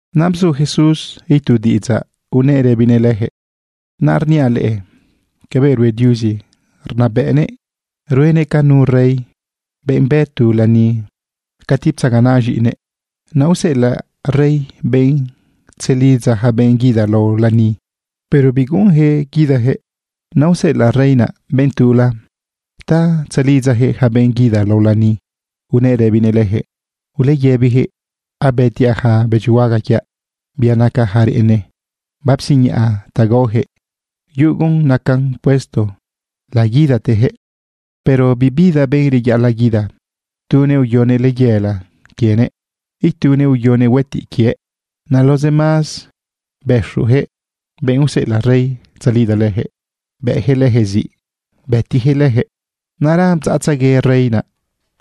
Naꞌ bzu Jesús itu diꞌidzaꞌ unëꞌ rëbinëꞌ lëjëꞌ: ―Naꞌ rniaꞌ leꞌe cabëꞌ rue Diuzi rnabëꞌnëꞌ. Ruenëꞌ ca nu rey, benꞌ bë tu lani cati ptzaganaꞌ z̃iꞌinëꞌ. Naꞌ useꞌelaꞌ rey benꞌ tzelidza ja benꞌ guida lao lani, pero biguꞌunjëꞌ guidajëꞌ. Naꞌ useꞌelaꞌ rey naꞌ benꞌ tula ta tzelidzajëꞌ ja benꞌ guida lao lani unëꞌ rëbinëꞌ lëjëꞌ: “Uleyëbijëꞌ abëtiaꞌ ja bëdyihuaga quiaꞌ, bia naca ja reꞌene, bapsiñaꞌa ta gaojëꞌ. Yugun nacan puesto laguidatejëꞌ.” Pero bibida benꞌ reyaꞌalaꞌ guida. Tunëꞌ uyonëꞌ layela quienëꞌ. Itunëꞌ uyonëꞌ huëtiꞌ quiëꞌ. Naꞌ los demás, bëxujëꞌ benꞌ useꞌelaꞌ rey tzalidza lëjëꞌ, bëꞌjëꞌ lëjëꞌ ziꞌ, bëtijëꞌ lëjëꞌ. Naꞌra bdzaꞌtzegue rey naꞌ.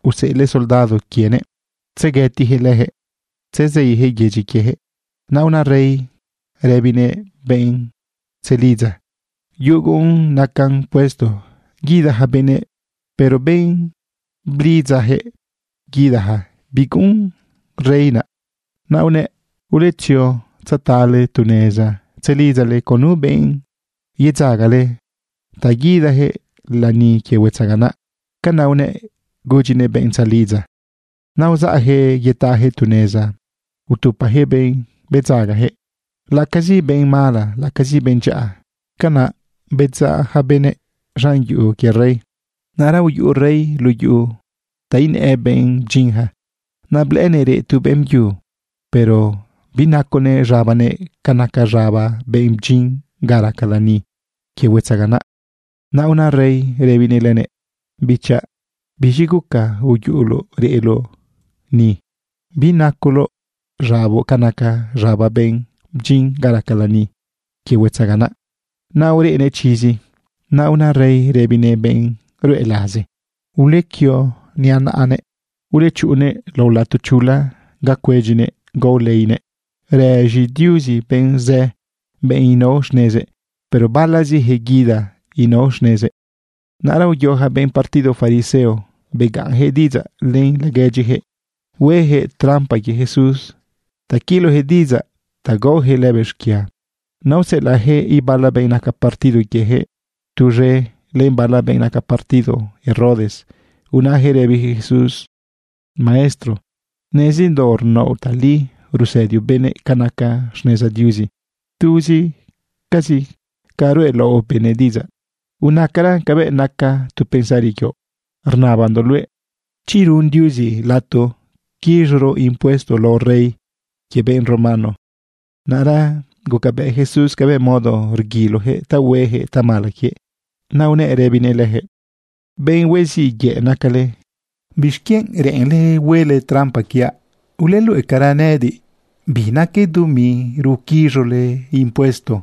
Useꞌelëꞌ soldado quienëꞌ tzeguëtijëꞌ lëjëꞌ, tzezeijëꞌ yedyi quiejëꞌ. Naꞌ una rey rëbinëꞌ benꞌ tzelidza: “Yugun nacan puesto guida ja benëꞌ.” Pero benꞌ blidzajëꞌ guidaja, biguꞌun rey naꞌ. Naꞌ unëꞌ: “Uletzio tzetale tu neza tzelidzale con nu benꞌ yedzagale ta guidajëꞌ lani quie huetzaganaꞌ.” Canaꞌ unëꞌ gudyinëꞌ benꞌ tzelidza. Naꞌ uzaꞌjëꞌ yetajëꞌ tu neza utupajëꞌ benꞌ bedzagajëꞌ, laꞌacazi benꞌ mala, laꞌacazi benꞌ dyaꞌa. Canaꞌ bedzaꞌ ja benëꞌ z̃an yuꞌu quie rey. ’Naꞌra uyuꞌu rey luꞌu yuꞌu ta inëꞌ benꞌ bdyinja. Naꞌ blëꞌënëꞌ reꞌ tu beꞌmbyu, pero binaconëꞌ z̃abanëꞌ ca naca z̃aba benꞌ bdyin ga raca lani quie huetzaganaꞌ. Naꞌ una rey rëbinëꞌ lënëꞌ: “Bichaꞌ, ¿biz̃i guca uyuꞌuloꞌ reꞌloꞌ ni, binacoloꞌ z̃aboꞌ ca naca z̃aba benꞌ bdyin ga raca lani quie huetzaganaꞌ?” Naꞌ ureꞌnëꞌ chizi. Naꞌ una rey rëbinëꞌ benꞌ ruꞌe laze: “Ulequio niꞌa naꞌanëꞌ. Ulechuꞌunnëꞌ lao lato chula ga cuedyinëꞌ gao leinëꞌ.” Rëz̃i Diuzi benꞌ zë, benꞌ inao xnezëꞌ, pero balazijëꞌ guida inao xnezëꞌ. Naꞌra uyo ja benꞌ partido fariseo begaꞌnjëꞌ diꞌidzaꞌ len laguedyijëꞌ huejëꞌ trampa quie Jesús ta quilojëꞌ diꞌidzaꞌ ta gaojëꞌ lëbëꞌ xquia. Naꞌ useꞌelaꞌjëꞌ ibala benꞌ naca partido quiejëꞌ tuz̃e len bala benꞌ naca partido Herodes, unajëꞌ rëbijëꞌ Jesús: ―Maestro, nezindoꞌ rnaoꞌ tali, rusëdioꞌ benëꞌ ca naca xneza Diuzi. Tuzicazi ca ruꞌelaoꞌ benëꞌ diꞌidzaꞌ. Unacara cabëꞌ naca tu pensari quioꞌ: ¿Rnabandoꞌ luëꞌ chi run Diuzi lato quiz̃oro impuesto lao rey quie benꞌ romano? Naꞌra gucabëꞌ Jesús cabëꞌ modo reguilojëꞌ ta huejëꞌ tamala quiëꞌ. Naꞌ unëꞌ rëbinëꞌ lëjëꞌ: ―Benꞌ huiziꞌ yëꞌ nacale. ¿Bixquienꞌ reꞌenle huele trampa quiaꞌ? Uleluꞌecara nëꞌëdiꞌ bi naque dumi ruquiz̃ole impuesto.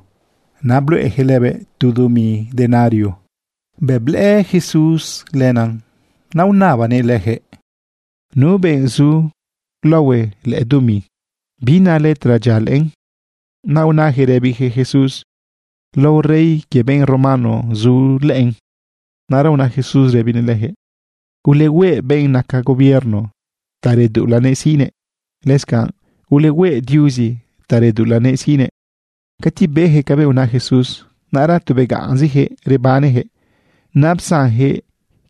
Naꞌ bluꞌejëꞌ lëbëꞌ tu dumi denario. Bëꞌ blëꞌë Jesús len, naꞌ unabanëꞌ lëjëꞌ: ―¿Nu benꞌ zu laohue lëꞌë dumi? ¿Bi na letra dyia lëꞌën? Naꞌ unajëꞌ rëbijëꞌ Jesús: ―Lao rey quie benꞌ romano zu lëꞌën. Naꞌra una Jesús rëbinëꞌ lëjëꞌ: ―Ulehueꞌ benꞌ naca gobierno ta reduꞌulanëꞌ siꞌnëꞌ. Lëscanꞌ ulehueꞌ Diuzi ta reduꞌulanëꞌ siꞌnëꞌ. Cati bejëꞌ cabëꞌ una Jesús, naꞌra tu begaꞌnzijëꞌ rebanejëꞌ. Naꞌ psanjëꞌ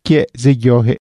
quiëꞌ zeyojëꞌ.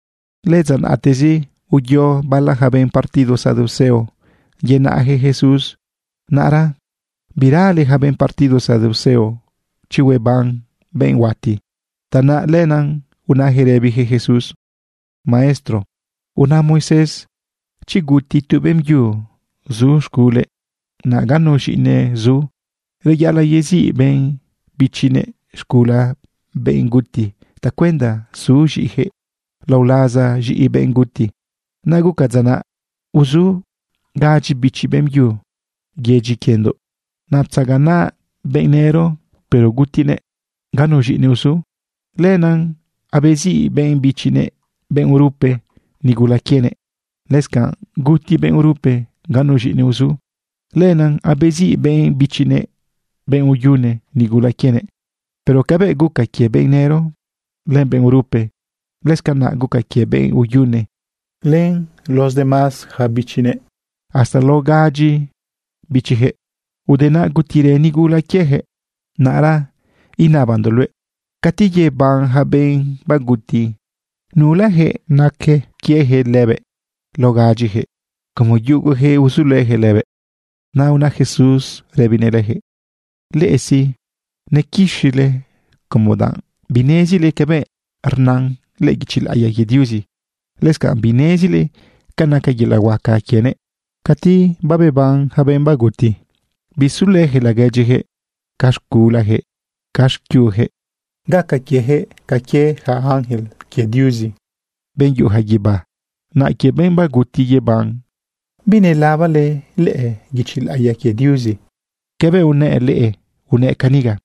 Lëdza naꞌtezi uyo bala ja benꞌ partido saduceo yenaꞌjëꞌ Jesús. Naꞌra birale ja benꞌ partido saduceo chi hueban benꞌ huati. Tanaꞌ lenaꞌ unajëꞌ rëbijëꞌ Jesús: ―Maestro, una Moisés chi guti tu beꞌmbyu zu z̃gule, naꞌ ganu z̃iꞌinëꞌ zu, reyaꞌalaꞌ yeziꞌ benꞌ bichinëꞌ xcula benꞌ guti tacuenda su z̃iꞌijëꞌ lao laza z̃iꞌi benꞌ guti. Naꞌ guca dza naꞌ uzu gadyi bichi beꞌmbyu yedyi quiendoꞌ. Naꞌ ptzaganaꞌ benꞌ nëro, pero gutinëꞌ ganu z̃iꞌinëꞌ uzu. Lenaꞌ abeziꞌ benꞌ bichinëꞌ, benꞌ urupe, nigula quienëꞌ. Lëscanꞌ guti benꞌ urupe ganu z̃iꞌinëꞌ uzu. Lenaꞌ abeziꞌ benꞌ bichinëꞌ, benꞌ uyune, nigula quienëꞌ. Pero cabëꞌ guca quie benꞌ nëro len benꞌ urupe, lëscanaꞌ guca quie benꞌ uyune len los demás yaca bichinëꞌ hasta lao gadyi bichijëꞌ. Ude naꞌ gutirë nigula quiejëꞌ. Naꞌra inabandoꞌ luëꞌ, cati yeban ja benꞌ baguti, ¿nulajëꞌ naquëꞌ quiejëꞌ lëbëꞌ lao gadyijëꞌ como yugujëꞌ uzulëjëꞌ lëbëꞌ? Naꞌ una Jesús rëbinëꞌ lëjëꞌ: ―Leꞌe sí, nequixile como danꞌ binezile cabëꞌ rnan lëꞌë guichi laꞌiya quie Diuzi. Lëscanꞌ binezile ca naca yelaꞌ huaca quienëꞌ. Cati babeban ja benꞌ baguti, bisulëjëꞌ laguedyijëꞌ ca z̃gulajëꞌ ca xquiujëꞌ. Gaca quiejëꞌ ca quie yaca ángel quie Diuzi, benꞌ yuꞌuja guibá. Naꞌ quie benꞌ baguti yeban, ¿binelabale lëꞌë guichi laꞌiya quie Diuzi cabëꞌ unëꞌ leꞌe? Unëꞌ caniga: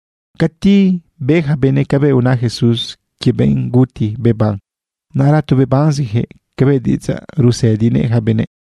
Cati be ja benëꞌ cabëꞌ una Jesús quie benꞌ guti beban, naꞌra tu bebanezijëꞌ cabëꞌ diꞌidzaꞌ rusëdinëꞌ ja benëꞌ.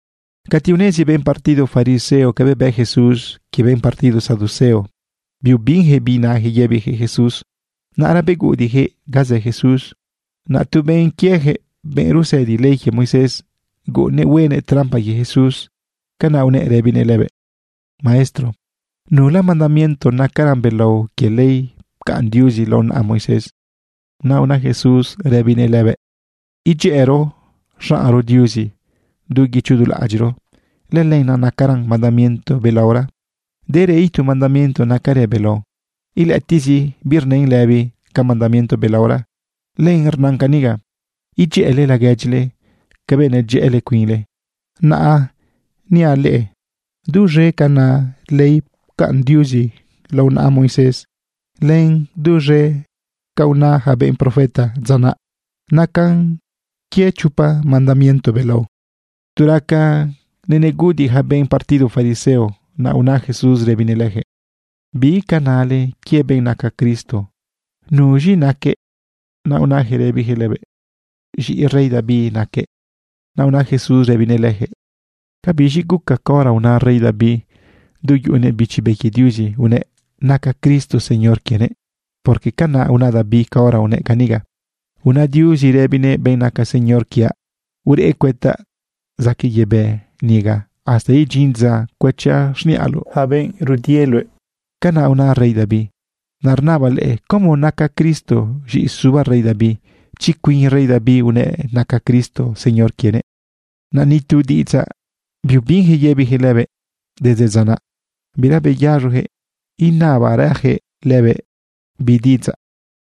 Cati unezi benꞌ partido fariseo cabëꞌ bë Jesús quie benꞌ partido saduceo, biubinjëꞌ binajëꞌ yëbijëꞌ Jesús, naꞌra beguꞌudiꞌjëꞌ ga zë Jesús. Naꞌ tu benꞌ quiejëꞌ, benꞌ rusëdi ley quie Moisés, guꞌunnëꞌ huenëꞌ trampa quie Jesús. Canaꞌ unëꞌ rëbinëꞌ lëbëꞌ: ―Maestro, ¿nula mandamiento nacaran belao quie ley pcaꞌn Diuzi lao naꞌa Moisés? Naꞌ una Jesús rëbinëꞌ lëbëꞌ: ―“Idyëꞌëro xaꞌnro Diuzi du guicho du laꞌadyiꞌro.” Lëlenaꞌ nacaran mandamiento belaora. Derë itu mandamiento nacarën belao. Ilëꞌëtiꞌzi birnën lëbi ca mandamiento belaora. Len rnan caniga: “Idyëꞌële laguedyile cabëꞌ nedyëꞌële cuinle.” Naꞌ niaꞌ leꞌe duz̃e ca na ley pcaꞌn Diuzi lao naꞌa Moisés len duz̃e ca una ja benꞌ profeta dza naꞌ, nacan quie chopa mandamiento belao. Tu raca neneguꞌudiꞌ ja benꞌ partido fariseo, naꞌ una Jesús rëbinëꞌ lëjëꞌ: ―¿Bi ca nale quie benꞌ naca Cristo? ¿Nu z̃iꞌinëꞌ naquëꞌ? Naꞌ unajëꞌ rëbijëꞌ lëbëꞌ: ―Z̃iꞌi rey David naquëꞌ. Naꞌ una Jesús rëbinëꞌ lëjëꞌ: ―¿Ca biz̃i guca caora una rey David, du yuꞌunëꞌ Bichi Be quie Diuzi, unëꞌ naca Cristo Señor quienëꞌ? Porque canaꞌ una David caora unëꞌ caniga: Una Diuzi rëbinëꞌ benꞌ naca Señor quiaꞌ: “Ureꞌ cuëtaꞌ zaquëꞌ yebë niga, hasta idyin dza cuëchaꞌ xniꞌaloꞌ yaca benꞌ rudie luëꞌ.” Canaꞌ una rey David. Naꞌ rnabaꞌ leꞌe, ¿cómo naca Cristo z̃iꞌi suba rey David, chi cuin rey David unëꞌ naca Cristo Señor quienëꞌ? Naꞌ ni tu diꞌidzaꞌ biubinjëꞌ yëbijëꞌ lëbëꞌ. Desde dza naꞌ, bira beyaz̃ojëꞌ inabarajëꞌ lëbëꞌ bi diꞌidzaꞌ.